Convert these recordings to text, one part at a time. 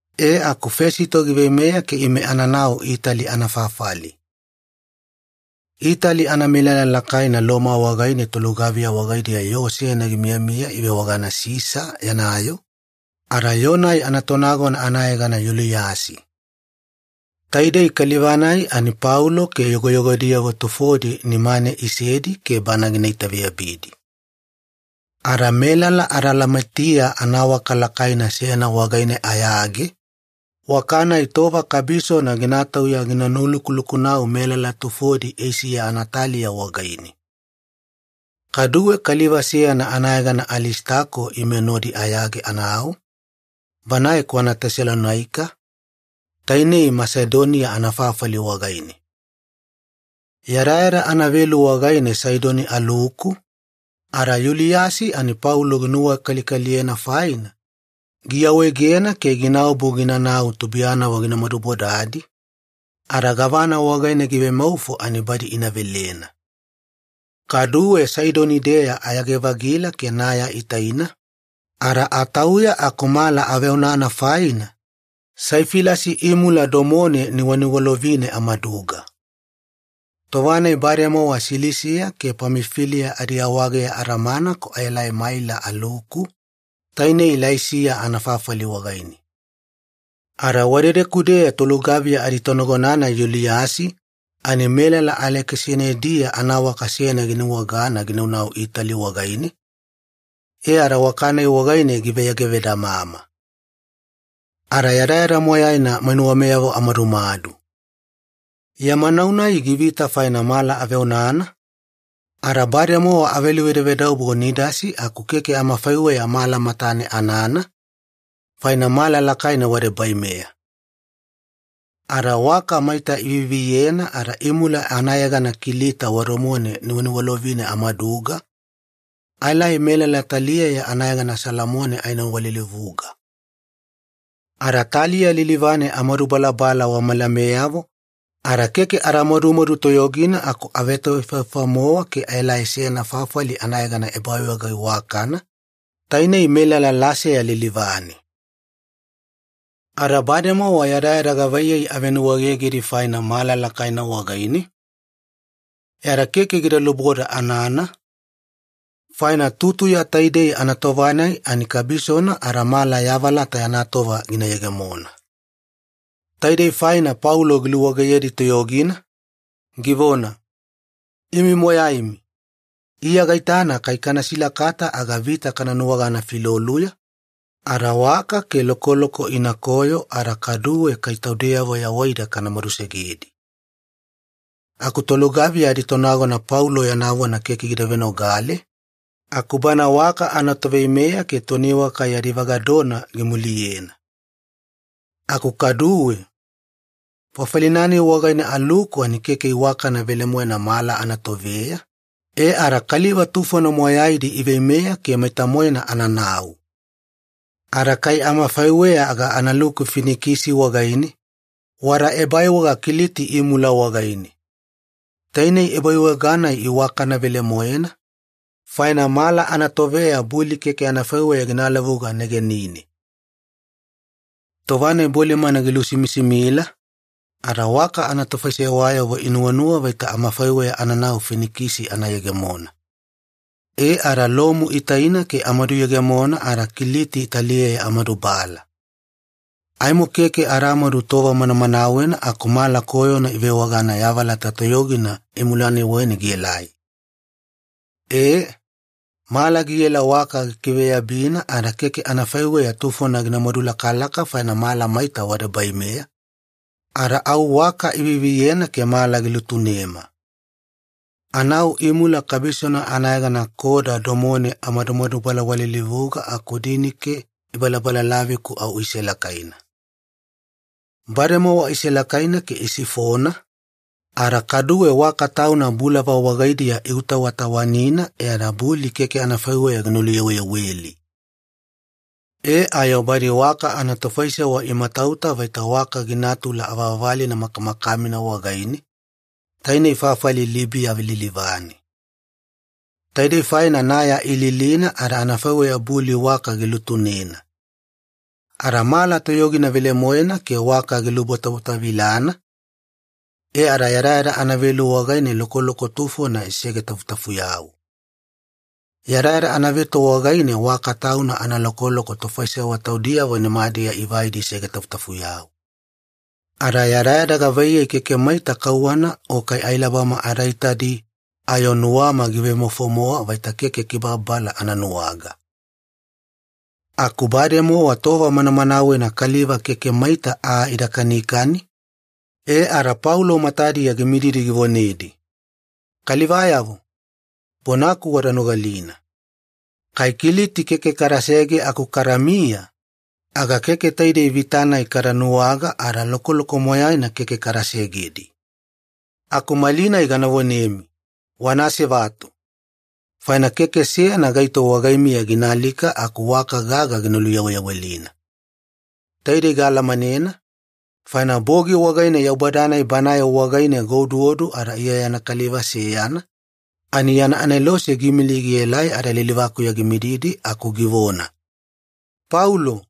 E aku Fesito giveimeya ke ime ananau Itali anafafali. Itali anamelala lakaina Loma wagaine tolugaviya wagaidiya yoo seyana gimiyamiya ivewagana ‘Sisa Yana Yoo’, ada yoo-nai anatonagona anayegana Yuliyasi. Taidei kaliva-nai ani Paulo ke yogoyogodiyavo tufodi nimane isedi ke bana gina itaveyabidi. Ada melala Adalamitia anawaka lakaina seyana wagaine ayage, waka-nai tova kabisona gina tauya gina nulukulukunau melala tufodi Eisiya anataliya wagaine. Kaduwe kaliva seyana anayegana Alisitako ime nodi ayage anau, banae kwana Tesalonaika, tainei Masedonia anafafali wagaine. Yadayada anavelu wagaine Saidoni aluku, ada Yuliyasi ani Paulo ginuwakalikaliyena faina, giawaegena ke ginaobu ginanau tubuiyanavo gina madubodadi ada gavana wagaine givemaufo ani badi ina velena. Kaduwe Saidoni-deya ayage-vagila ke naya itaina ada atauya aku mala aveonana faina, Saifilasi imula domone niwaniwalovine amaduga. Tova-nai bademowa Silisiya ke Pamifiliya adiawageya adamana aku aelai Maila aluku, tainei Laisiya anafafali wagaine. Ada wadedeku-deya tolugaviya aditonagona-nai Yuliyasi ani melala Alekisanidia anawaka seyana ginuwagana ginaunau Itali wagaine, e ada waka-nai wagaine giveyagevedamama. Ada yadayada moyaina mainuwameyavo amadumadu. Yama nau-nai givita faina mala aveonana, ada bademowa aveluvedavedaubo Nidasi aku keke amafaiweya mala matane anana, faina mala lakaina wadebaimeya. Ada waka maita iviviyena ada imula anayegana Kiliti wadomone niwaniwalovine amaduga, aelai melala taliyeya anayegana Salamone aenowalilivuga. Ada taliya lilivane amadumadubala wamalameyavo ada keke ada madumadu toyogina aku avetoefaefa-mowa ke aelai seyana fafali anayegana Ebaiwaga Iwakana, tainei melala Lasea lilivane. Ada bademowa yadayada gavaiyei avenuwaegegedi faina mala lakaina wagaine, e ada keke gida luboda anana, faina tutuya taidei anatova-nai ani kabisona ada mala yavalata yana tova gina yegemona. Taidei faina Paulo giluwageyedi toyogina, givona, “Imi moyaimi, Iya gaitana kai kana silakata aga vita kana nuwagana filoluya, ada waka ke lokoloko inakoyo ada kaduwe kai taudeyavo yawaida kana madusegedi.” Aku tolugaviya aditonagona Paulo yana vona keke gida venogale, aku bana waka anatoveimeya ke toniwaka yadi vagadona gimuliyena. Aku kaduwe, fafali-nai wagaine aluku ani keke iwakana velemoena mala anatoveya, e ada kaliva tufona moyaidi iveimeya ke maita-moena ananau. Ada kai amafaiweya aga analuku Finikisi wagaine, wada ebaiwaga Kiliti imula wagaine. Tainei ebaiwaga-nai iwakana velemoena, faina mala anatoveya buli keke anafaiweya gina lavuga negenine. Tova-nai bolimana gilusimisimila, ada waka anatofaisewayavo inuwanuwa vaita amafaiweya ananau Finikisi ana yegemona. E ada lomu itaina ke amaduyegemona ada Kiliti taliyeya amadubala. Aimo keke adamadu tova manamanawena aku mala koyona ivewagana ‘yavalata toyogina’ imula-nai waina gielai. E, mala giela waka gikiveyabina ada keke anafaiweya tufona ginamadu lakalaka faina mala maita wadebaimeya, ada au waka iviviyena ke mala gilutunema. Anau imula kabisona anayegana Koda domone amadumadubalawalilivuga aku dinike ibalabalalavi-ku au iselakaina. Bademowa iselakaina ke isifona, ada kaduwe waka tauna bulava wagaidiya iutawatawanina e ada buli keke anafaiweya gina luyaweyaweli. E ayo badi waka anatofaisewa imatauta vaita waka ginatula avavalina makamakamina wagaine, tainei fafali Libiya lilivane. Taidei faina naya ililina ada anafaiweya buli waka gilutunena. Ada mala toyogina velemoena ke waka gilubwatabwatavilana, e ada yadayada anavelu wagaine lokoloko tufona isegetafutafuyau. Yadayada anaveto wagaine waka tauna analokoloko tofaisewa taudiyavo nimadiya ivaidi isegetafutafuyau. Ada yadayada gavaiyei keke maita kauwana o kai ailabama ada itadi ayo nuwama givemaufo-mowa vaita keke kibababala ana nuwaga. Aku bademowa tova manamanawena kaliva keke maita aa ida kanikani, e ada Paulo matadiya gimididi givonedi, “Kalivayavo, bonaku wada nogalina. Kai Kiliti keke kadasege aku kadamiya, aga keke taidei vita-nai kada nuwaga ada lokoloko moyaina keke kada segedi. Aku malinai gana vonemi, wana asevatu! Faina keke seyana gaito wagaimiya gina alika aku waka gagana gina luyaweyawelina. Taidei gaalamanena, faina bogi wagaine Yaubada-nai Banae wagaine gaoduodu ada Iya yana kaliva seyana, ani yana anelose giimili gielai ada lilivakuya gimididi aku givona, ‘Paulo,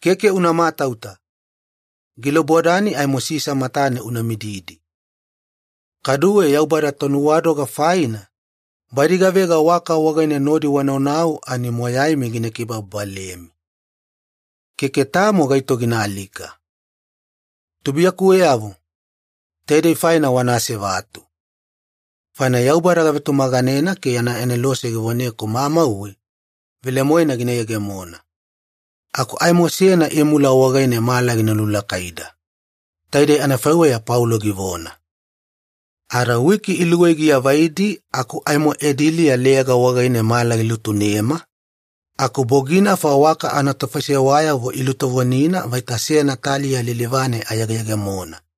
keke una matauta! Gilubodani aimo Sisa matane una mididi. Kaduwe Yaubada tonuwadoga faina, badi gavega waka wagaine nodi wanaunau ani moyaimi gina kibababalemi. Keke tamo gaito gina alika.’ Tubuiyakuweyavo, taidei faina wana asevatu. Faina Yaubada gavetumaganena ke yana anelose givoneku mamauwe, velemoena gina yegemona. Aku aimo seyana imula wagaine mala gina lulakaida.” Taidei anafaiweya Paulo givona. Ada wiki iluwei giavaidi aku aimo Ediliya Leyaga wagaine mala gilutunema, aku boginafa waka anatofaisewayavo ilutovonina vaita seyana taliya lilivane ayegeyegemona.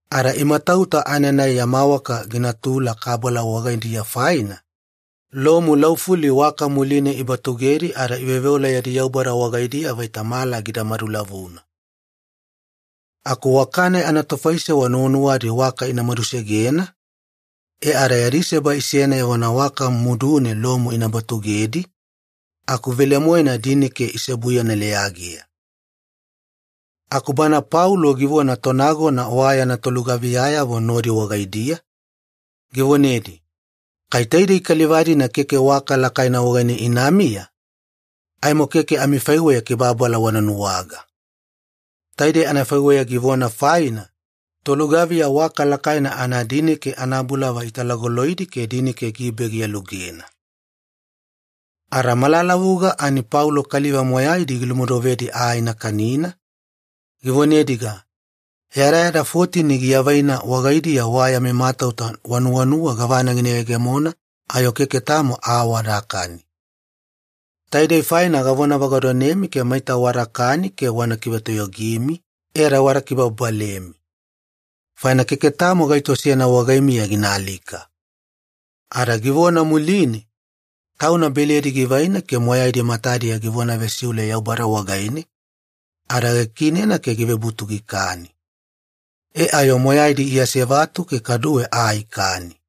Ada imatauta aenanai yama waka ginatula kabala wagaidiya faina, lomu laufuli waka muline ibatugedi ada iveoveola yadi yaubada wagaidiya vaita mala gida madulavuna. Aku waka-nai anatofaisewa nuwanuwadi waka ina madusegena, e ada yadi seba isena evona waka mudune lomu ina batugedi, aku velemoena dinike iseobuyena leyageya. Aku bana Paulo givona tonagona wa yana tolugaviyayavo nodi wagaidiya, givonedi, “Kai taidei kaliva-dina keke waka lakaina wagaine inamiya, aimo keke amifaiweya kibababala wana nuwaga.” Taidei anafaiweya givona faina, tolugaviya waka lakaina anadinike anabulava italagoloidi ke dinike gibe gialugena. Ada malalavulavuga ani Paulo kaliva moyaidi gilumodovedi aa ina kanina, givonediga, “Yadayada fotini giavaina wagaidiya wa yami matauta wanuwanuwa gavana gina yegemona ayo keke tamo aa wadakani. Taidei faina gavona vagadonemi ke maita wadakani ke wana kivetoyogimi, e ada wana kibababalemi. Faina keke tamo gaito seyana wagaimiya gina alika.” Ada givona muline, tauna beledi givaina ke moyaidi matadiya givona vesiule Yaubada wagaine, ada gikiinena ke givebutu gikani. E ayo moyaidi iasevatu ke kaduwe aa ikani.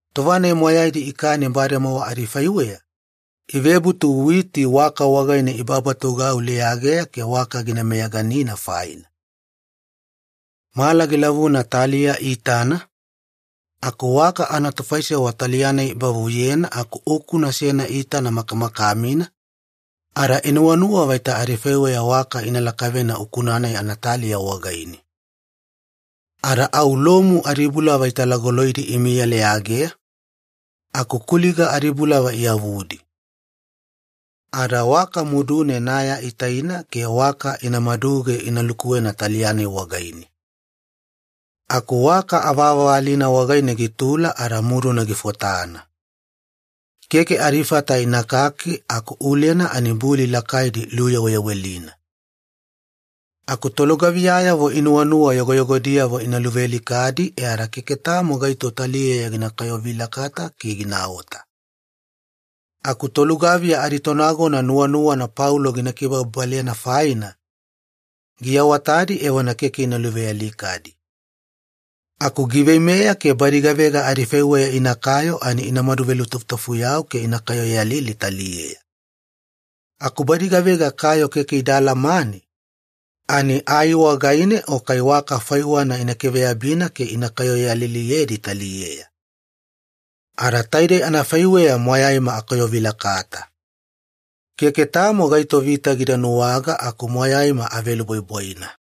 Tova-nai moyaidi ikani bademowa adifaiweya, ivebutu witi waka wagaine ibabatugau leyageya ke waka gina meyaganina faina. Mala gilavuna taliya iitana, aku waka anatofaisewa taliya-nai ibavuyena aku ukuna seyana iitana makamakamina, ada inuwanuwa vaita adifaiweya waka ina lakavena ukuna-nai anataliya wagaine. Ada au lomu adibulava italagoloidi imiya leyageya, aku kuliga adibulava iyavudi. Ada waka mudune naya itaina ke waka ina maduge ina lukuwena taliya-nai wagaine. Aku waka avavalina wagaine gitula ada muduna gifotana. Keke adifata inakaki aku ulena ani buli lakaidi iluyaweyawelina. Aku tolugaviyayavo inuwanuwa yogoyogodiyavo ina luvealikadi e ada keke tamo gaito taliyeya gina kayovilakata ke ginaota. Aku tolugaviya aditonagona nuwanuwana Paulo gina kibababalena faina, giawatadi evona keke ina luvealikadi. Aku giveimeya ke badi gavega adifaiweya inakayo ani inamadu velutafutafuyau ke ina kayoyalili taliyeya. Aku badi gavega kayo keke ida alamane, ani ai wagaine o kai waka faiwana ina kiveyabina ke ina kayoyaliliyedi taliyeya. Ada taidei anafaiweya moyaima akayovilakata. Keke tamo gaito vita gida nuwaga aku moyaima avelubwaibwaina.